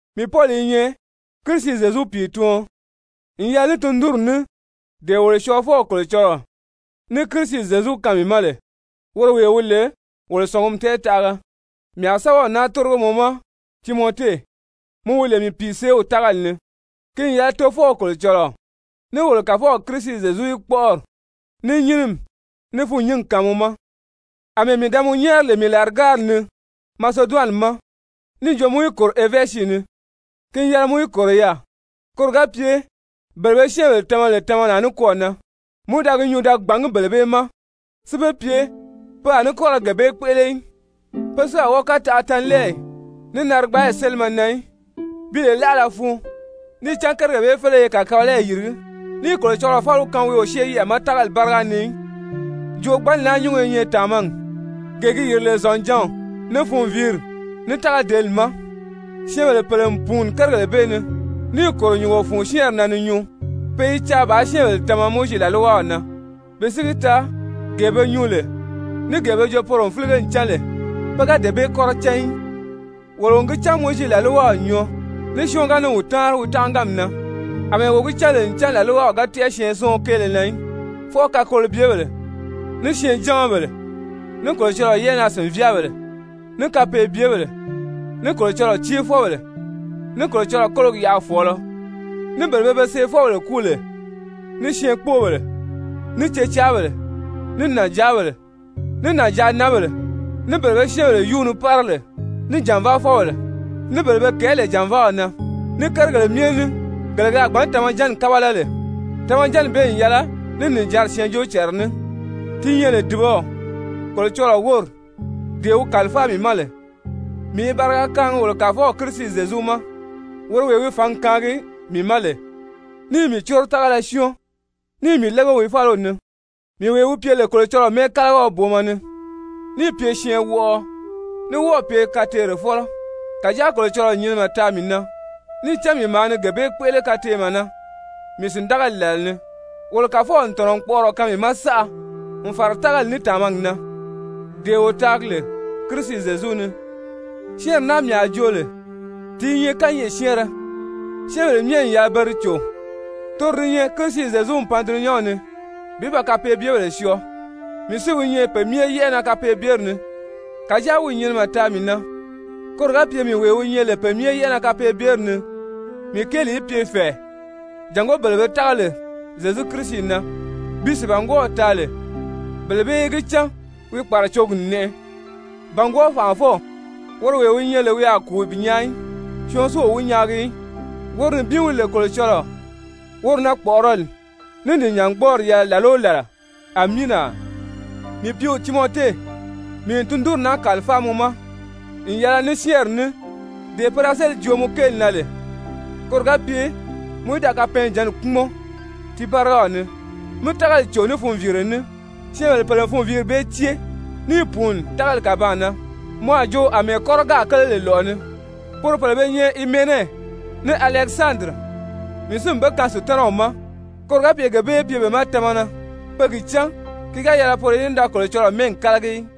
Mii Pɔli i nyɛ Kirisi Zyezu pìituɔn n yɛlɛ ní tundunri ní dee wolo Syɔɔfɔw Kolocɔlɔɔ ní Kirisi Zyezu kaan mii ma lè, woro wee wi lè wolo sɔ̀ngumi tɛɛtaʔaga. Mii a sɛ́bɛw naa tórigo mɔ ma, Timɔte, mɔ wi lè mii pìiseew tágali ni, ki n yɛlɛ Tofɔw Kolocɔlɔɔ ní wolo Kàfɔw Kirisi Zyezu í kpɔ́ʔɔri, ní nyínimi, ní fûnnyingi kaan mɔ ma. Amɛɛ mii da mɔ nyɛ́ɛri lè mii làrigárili ni Maseduwani ma níì jo mɔ í kòro Efɛzi ni, ki n yɛlɛ mɔ í kòro yaà, koro ga pye bele be syɛ́ɛnbèle tama lè tamalaa nikwɔɔ na, mɔ í da gi nyuu da gbàngí bele bee ma si be pye pe a ní kɔ́ ra gee bee kpéʔele í, pe si a wɔ́ɔ kɔ́ taʔa tanlɛɛyi ní narigbaayi sélimɛ na í bi lè láʔala fun, níì cán kérigèle bee félege i kàkabalayi yìrigí, níì Kolocɔlɔɔ fáliw kaan wi o syée yɛʔɛ ma tágali báriga ni í. Joogbanni naa nyúngo i nyɛ tàmagi, gee gi yìri lè zɔ̀njǎnw, ní funviiri, ní tágadeeli ma. Syɛ́ɛnbèle pèle n pùuni kérigèle bee ni, níì kòro nyùngo fun syɛ́ɛnri na ni nyuu. Pe i caa bàā syɛ́ɛnbèle tama Mowizi làlwaw na, bi si gi taa dee be nyuu lè, ní gee be joo poro n fílige n cán lè, pe ga dee bee kɔ́rɔ cán í. Wolo n gi cán ncan Mowizi làlwaw n nyɔɔ, ní syɔɔn ga ni wi táanri wi tánʔaganmi na, àmɛɛ wo gi cán lè ncan làlwaw ga tɛ́ʔɛ syɛɛnsiɔn kéele na í, fwɔɔ kakolobyebèle, ní syɛɛnjamabèle, ní Kolocɔlɔɔ yɛ́ʔɛnaa-sìnvyaabèle, ní kapeebyebèle, ní Kolocɔlɔɔ céefɔbèle, ní Kolocɔlɔɔ kólogi yaʔafɔɔlɔ, ní bele pe be seefɔbèle kúu lè, ní syɛɛnkpoobèle, ní cecaabèle, ní nànjaabèle, ní nànjaananbèle, ní bele be syɛ́ɛnbèle yúu ni pára lè, ní jànvaafɔbèle, ní bele be kɛ̀ɛ́ lè jànvaaw na, ní kérigèle myɛ ní gele ke a gbǎn tamajanni kábala lè. Tamajanni bee n yɛlɛ ní nìjanri syɛɛnjóocànra ní, ti nyɛ lè dùbaw Kolocɔlɔɔ wóri, dee wi kàlifáa mii ma lè. Mii i bariga kaangi wolo Kàfɔw Kirisi Zyezu ma, woro wee wi fǎngi kaangi mii ma lè níì mii córo tágala syɔ́ɔn, níì mii lége wi fáliw ni, mii wee wi pye lè Kolocɔlɔɔ mɛ́ɛkalagiɔ booma ni, níì pye syɛɛnwɔʔɔɔ, ní wɔ́ɔ̀ pye kateerefɔlɔ. Kàjáa Kolocɔlɔɔ n nyinimɛ taa mii na, níì cán mii maa ni gee bee kpéʔele kateemɛ na mii sìndagali làla ni. Wolo Kàfɔw n tɔ̀nɔ n kpɔʔɔrɔ kaan mii ma saʔa, n fàra tágali, ní tàmagi na, dee wo taagi lè Kirisi Zyezu ni. Syɛ́ɛnri naa mii a joo lè ti i nyɛ kányɛʔɛ syɛ́ɛnrɛ, syɛ́ɛnbèle myɛ n yɛlɛ pe di cò, toro di nyɛ Kirisi Zyezu n pan dulunyanw ni bi ba kapeebyebèle syɔɔ, mii si wi nyɛ pe myɛ yɛ́ʔɛ na kapeebyeri ni. Kàjáa wi n nyinimɛ taa mii na, koro ga pye mii wee wi nyɛ lè pe myɛ yɛ́ʔɛ na kapeebyeri ni, mii kéeli í pye fɛ̀ɛ jàngó bele pe a tága lè Zyezu Kirisi na bi sìibangwɔɔw taa lè, bele bee í gi cán wi kpàracogi n nɛʔɛ. Bàngwɔɔ Fànʔafɔw, woro wee wi nyɛ lè wi a kùu bi nyaa í, syɔɔn si o wi nyaagi í, woro nibin wi lè Kolocɔlɔɔ, woro na kpɔ̀ʔɔrɔli ní nìjangbɔɔri yɛlɛ làla o làla! Amiina! Mii pìíw Timɔte, mii n tundunri naa kàlifáa mɔ ma n yɛlɛ ní syɛ́ɛnri ní dee pe da sélì joo mɔ kéeli na lè, koro ga pye mɔ í da kapɛɛnjǎnni kpúmɔn ti bárigaw ni, mí tágali cò ní funviire ní. Syɛ́ɛnbèle pèle n funviiri bee cée níì pùuni tágali kàbaan na, mɔ a jo àmɛɛ kɔ́rɔ gáà kéle lɔ̀ʔɔ ni lè. Poro pèle be nyɛ Himene ní Alɛkisandiri, mii si n be kaan Sutanaw ma koro ga pye gee bee í pye be ma tamana pe gi cán ki ga yɛlɛ poro í da Kolocɔlɔɔ mɛ́ɛgi kálagi í.